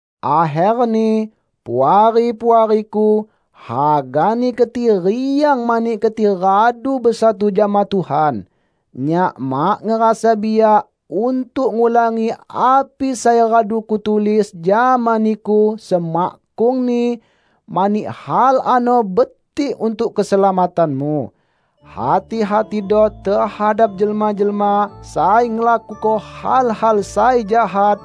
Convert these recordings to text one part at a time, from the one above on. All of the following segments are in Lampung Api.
Akherni, Puari-puariku, hagani keti riang mani keti radu besatu jama Tuhan. Nyak mak ngerasa biak untuk ngulangi api sai radu kutulis jama niku semakkungni, mani hal ano betik untuk keselamatanmu. Hati-hatido tehadap jelma-jelma sai ngelakuko hal-hal sai jahat,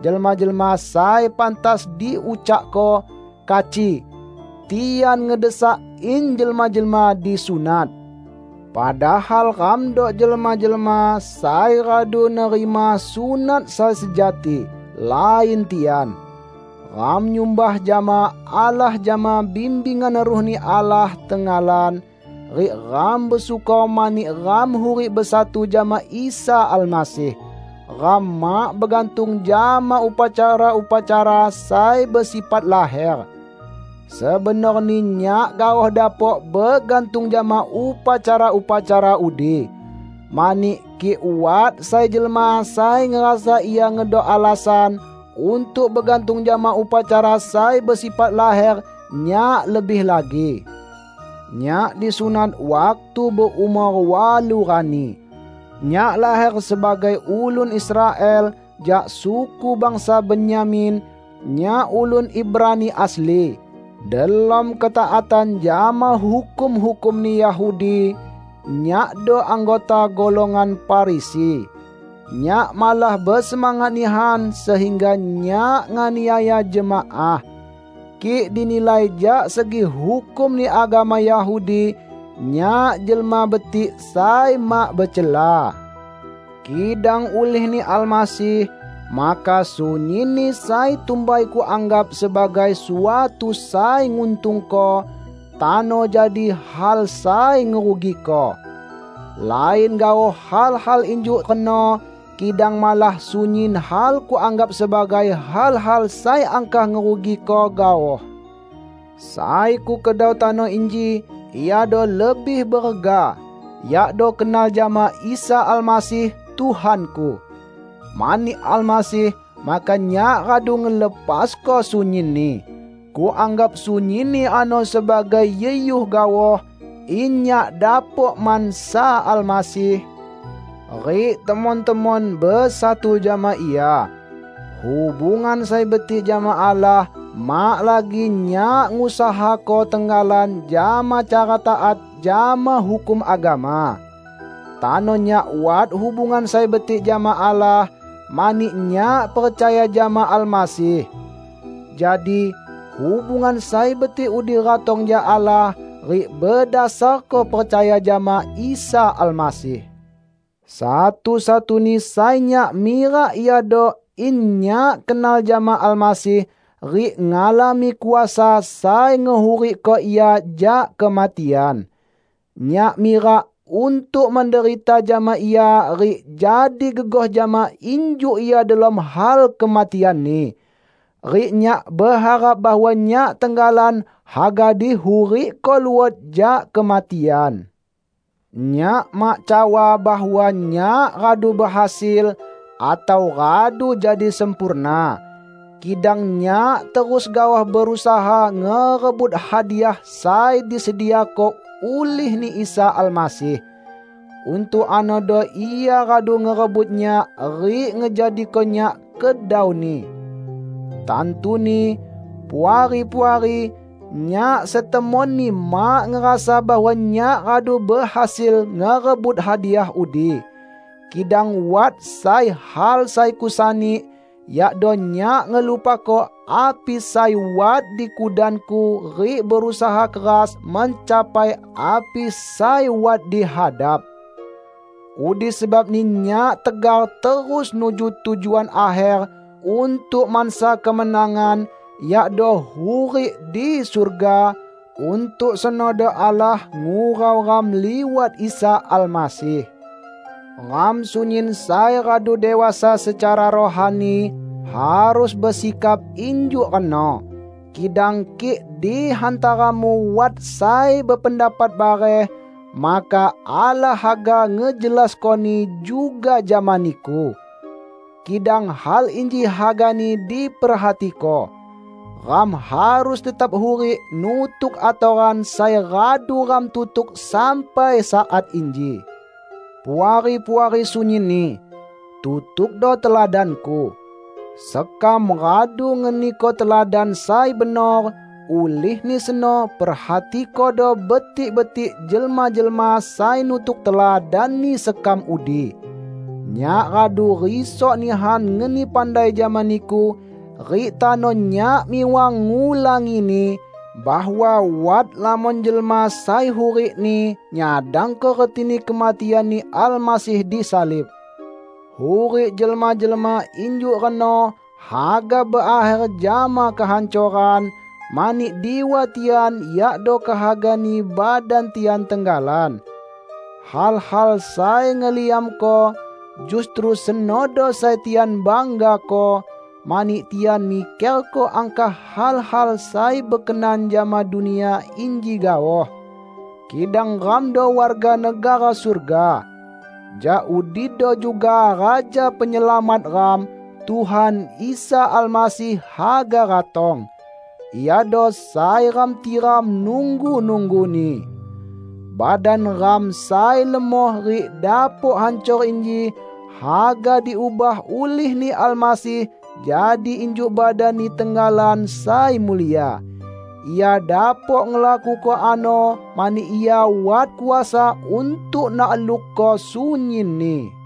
jelma-jelma sai pantas diucakko 'kaci'. Tian ngedesak in jelma-jelma disunat. Padahal ramdo jelma-jelma sai radu nerima sunat sai sejati, lain tian. Ram nyumbah jama Allah jama bimbingan Ruh-Ni Allah tenggalan, rik ram besyukor mani ram hurik besatu jama Isa Almasih. Ram mak begantung jama upacara-upacara sai besifat laher. Sebenorni nyak gaoh dapok begantung jama upacara-upacara udi. Mani kik wat sai jelma sai ngerasa ia ngedok alasan untuk begantung jama upacara sai besifat laher, nyak lebih lagi. Nyak disunat waktu beumor walu rani. Nyak laher sebagai ulun Israel, jak suku bangsa Benyamin; nyak ulun Ibrani asli. Delom ketaatan jama hukum-hukumni Yahudi, nyakdo anggota golongan Farisi. Nyak malah besemangat nihan sehingga nyak nganiaya jemaah. Kik dinilai jak segi hukumni agama Yahudi, nyak jelma betik sai mak becela. Kidang ulih-Ni Almasih, maka sunyinni sai tumbai kuanggap sebagai suatu sai nguntungko, tano jadi hal sai ngerugiko. Lain gaoh hal-hal injuk reno; kidang malah sunyin hal kuanggap sebagai hal-hal sai angkah ngerugiko gaoh. Sai kukedau tano inji iado lebih berega: yakdo kenal jama Isa Almasih, Tuhanku. Mani Almasih, maka nyak radu ngelepasko sunyinni. Kuanggap sunyinni ano sebagai yuhyuh gaoh, in nyak dapok mansa Almasih, rik temon-temon besatu jama Ia. Hubungan sai betik jama Allah mak lagi nyak ngusahako tenggalan jama cara taat jama hukum agama. Tano nyak wat hubungan sai betik jama Allah, mani nyak percaya jama Almasih. Jadi, hubungan sai betik udi ratong jak Allah, rik bedasarko percaya jama Isa Almasih. Satu-satuni sai nyak mirak iado in nyak kenal jama Almasih, rik ngalami kuasa sai ngehurikko Ia jak kematian. Nyak mirak untuk menderita jama Ia rik jadi gegoh jama injuk Ia delom hal kematian-Ni. Rik nyak beharap bahwa nyak tenggalan haga dihurikko luot jak kematian. Nyak mak cawa bahwa nyak radu behasil, atau radu jadi sempurna. Kidang nyak terus gaoh berusaha ngerebut hadiah sai disediako ulih-Ni Isa Almasih. Untuk anodo Ia radu ngerebut nyak rik ngejadiko nyak kedau-Ni. Tantuni, Puari-puari, nyak setemonni mak ngerasa bahwa nyak radu behasil ngerebut hadiah udi. Kidang wat sai hal sai kusani, yakdo nyak ngelupako api sai wat di kudanku rik berusaha keras mencapai api sai wat di hadap. Udi sebabni nyak tegar terus nuju tujuan akher untuk mansa kemenangan, yakdo hurik di surga; untuk senodo Allah ngurau ram liwat Isa Almasih. Ram sunyin sai radu dewasa secara rohani, harus besikap injuk reno. Kidang kik di hantaramu wat sai bependapat bareh, maka Allah haga ngejelaskoni juga jama niku. Kidang hal inji hagani diperhatiko: Ram harus tetap hurik nutuk atoran sai radu ram tutuk sampai saat inji. Puari-puari sunyinni! Tutukdo teladanku. Sekam radu ngeniko teladan sai benor, ulihni seno perhatikodo betik-betik jelma-jelma sai nutuk teladanni sekam udi. Nyak radu risok nihan ngeni pandai jama niku, rik tano nyak miwang ngulangini, bahwa wat lamon jelma sai hurikni nyadangko retini kematian-Ni Almasih disalib. Hurik jelma-jelma injuk reno haga berakher jama kehancoran, mani diwa tian yakdo kehagani badan tian tenggalan. Hal-hal sai ngeliamko, justru senodo sai tian banggako; mani tian mikerko angkah hal-hal sai bekenan jama dunia inji gaoh. Kidang ramdo warga negara surga. Jak udido juga Raja Penyelamat ram, Tuhan Isa Almasih haga ratong. Iado sai ram tiram nunggu-nungguni. Badan ram sai lemoh rik dapok hancor inji, haga diubah ulih-Ni Almasih jadi injuk badan-Ni tenggalan sai mulia. Ia dapok ngelakuko ano mani Ia wat kuasa untuk naklukko sunyinni.